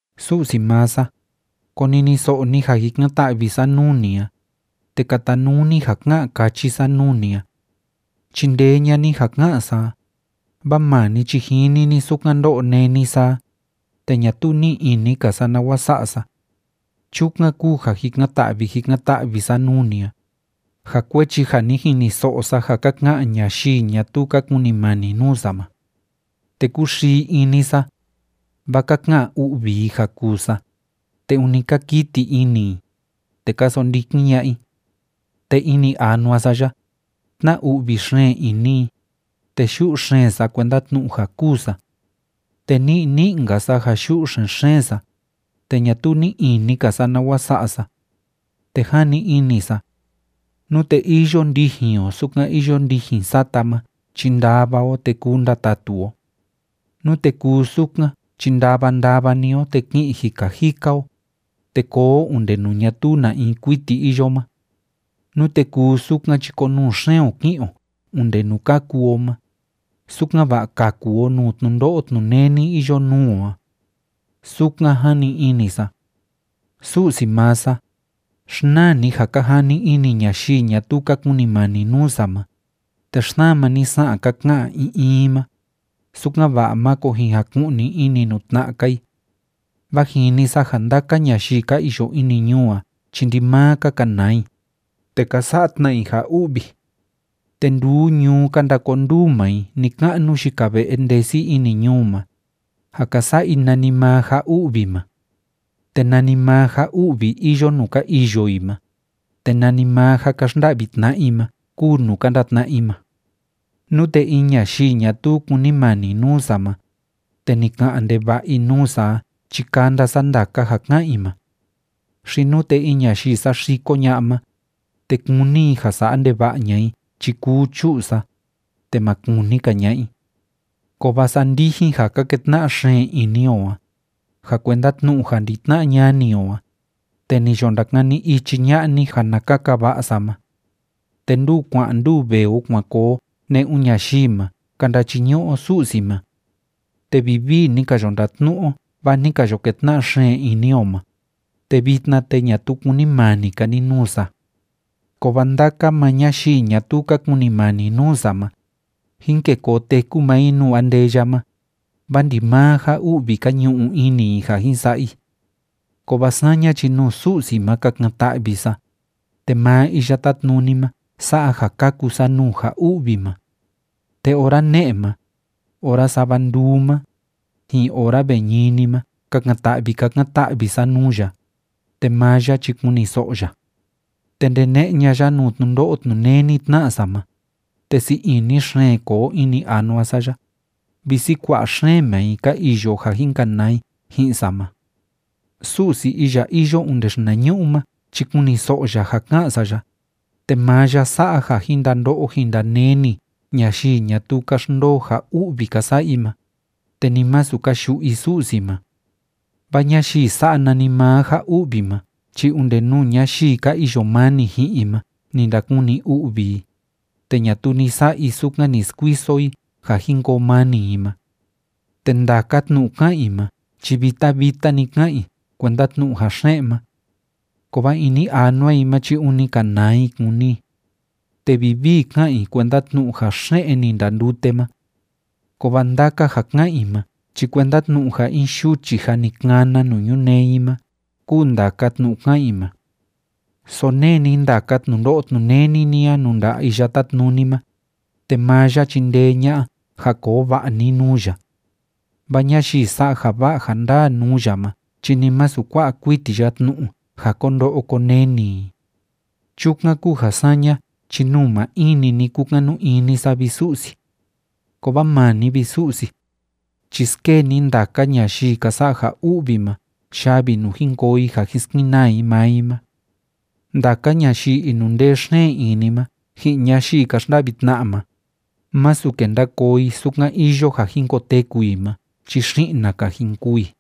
Su'si maa sa, koniniso'o ni ja jikan‑ta'vi sa nuu ni a, te katanuu ni ja ká'an káchi sa nuu ni a. Chindee ña'a ni ja ká'an sa a, vaa maa ni chi jini ni sukan ndó'o néni sa a, te ñatuu ni'i ini‑ka sa nawa sa'a sa. Chukan kúu ja jikan‑ta'vi jikan‑ta'vi sa nuu ni a, ja kuechi ja ni jiniso'o sa ja ka ka'an ñayii ñatuu ka kunimani nuu sa ma. Te kúxii ini sa, vaa ka ka'an u'vi i ja kuu sa, te ûni ka kiti ini i, te ka sondikin ña'a i. Te ini anua sa ya, tna‑u'vi xeen ini i, te yu'u xeen sa kuenda tnu'u ja kûu sa. Te ni'i ni'i‑nka sa ja yu'u xen‑xeen sa, te ñatuu ní'i ini‑ka sa nawa sa'a sa. Te jani ini sa, “Nute iyo ndijin o sukan iyo ndijin sata ma chi ndava o, te kuu ndatatu o. Nute kuu sukan chi ndava ndava‑ni o te ki'in jika jika o, te koo o onde nuu ñatuu na in kuiti iyo ma. Nute kuu sukan chi konuu xeen o ki'in o onde nuu kaku o ma, sukan‑va'a kaku o nuu tnundo'o tnuneni iyo nuu o a.” Sukan jani ini sa. Su'si maa sa, xnaa ni ja ka jani ini ñayii ñatuu ka kunimani nuu sa ma, te xsama ni sa'an ka ka'an in in i ma, sukan‑va'a máko jin jaku'ni ini nuu tna'a‑ka i. Vaa jini sa ja ndaka ñayii ka iyo ini ñuu a chi ndimaa ka kanaa i, te ka sa'a tna i ja u'vi. Te nduu ñuu ka ndakonduu maa i ni‑ka'nu yika ve'e ndesi ini ñuu ma, ja ka sa'a i nanimaa ja u'vi ma. Te nanimaa ja u'vi iyo nuu ka iyo i ma, te nanimaa ja ka xnda'vi tna'a i ma kúu nuu ka ndatna'a i ma. Nute in ñayii ñatuu kúnimani nuu sa ma, te ni ka'an ndeva'a i nuu sa a chi kanda sa ndaka ja ká'an i ma. Xi nute in ñayii saxiko ña'a ma, te kúni i ja sa'a ndeva'a ña'a i chi kuu chu'u sa, te ma kuni‑ka ña'a i. Kovaa saa ndijin ja ka ketna'a xeen ini o a, ja kuenda tnu'u ja ndi‑tna'a ñani o a, te ni yo ndakani ichi ña'a ni ja na kaka va'a sa ma. Te nduu kua'an nduu vee o kuan koo o ne'un ñayii ma ka ndachiñu'u o Su'si ma. Te vivii ni ka yo ndatnu'u o vaa ni ka yo ketna'a xeen ini o ma, te vitna, te ñatuu kúnimani‑ka ni nuu sa. Kovaa ndaka maa ñayii ñatuu ka kunimani nuu sa ma, jin kê koo teku maa i nuu andeya ma, vaa ndimaa ja u'vi ka ñu'u ini i ja jin sa'a i. Kovaa saña chi nuu Su'si ma kakan‑ta'vi sa, te maa Iya Tátnuni ma sa'a ja kaku sa nuu ja u'vi ma. Te ora ne'e ma, ora sava nduu ma, ji'in ora ve ñini ma kakan‑ta'vi kakan‑ta'vi sa nuu ya, te maa ya chi kuniso'o ya. Te ndene'e ña'a ya nuu tnundo'o tnuneni tna'a sa ma, te sii ini xeen koo ini anua sa ya, visi kua'a xeen maa i ka iyo ja jin kanaa i ji'in sa ma. Su'si iya iyo onde xinañu'u ma chi kuniso'o ya ja ká'an sa ya, te maa ya sa'a ja jin ndando'o jin ndaneni ñayii ñatuu ka xndoo ja u'vi ka sa'a i ma, te ni masu ka yu'u i Su'si ma. Vaa ñayii sa'a nanimaa ja u'vi ma chi onde nuu ñayii ka iyo mani ji'in i ma ni ndakuni u'vi i, te ñatuu ni sa'a i sukan ni skuiso i ja jin koo mani i ma. Te ndaka tnu'u ká'an i ma chi vita vita‑ni ká'an i kuenda tnu'u ja xe'en ma. Kovaa ini anua i ma chi ûni kanaa i kúni i. Te vivii ká'an i kuenda tnu'u ja xe'en ni ndandute ma. Kovaa ndaka ja ká'an i ma chi kuenda tnu'u ja in yuchi jâ ni kana nuu ñunee i ma kúu ndaka tnu'u ká'an i ma. Sonee ni ndaka tnundo'o tnuneni ni a nuu nda'a Iya Tátnuni ma, te maa ya chindee ña'a ja koo va'a ni nuu ya. Vaa ñayii sa'a ja va'a ja ndaa nuu ya ma chi ni masu kua'a kuiti ya tnu'u ja ko ndo'o ko neni i. Chukan kúu ja saña chi nuu maa in‑ni ni kukanu ini sa, vi Su'si. Kovaa maa ni, vi Su'si, chi skee ni ndaka ñayii ka sa'a ja u'vi ma yavi nuu jin koo i ja jin skenaa i maa i ma. Ndaka ñayii inundee xeen ini ma ji'in ñayii ka xnda'vi tna'a ma, másu kenda koo i sukan iyo ja jin koteku i ma chi xi'na‑ka jin kûu i.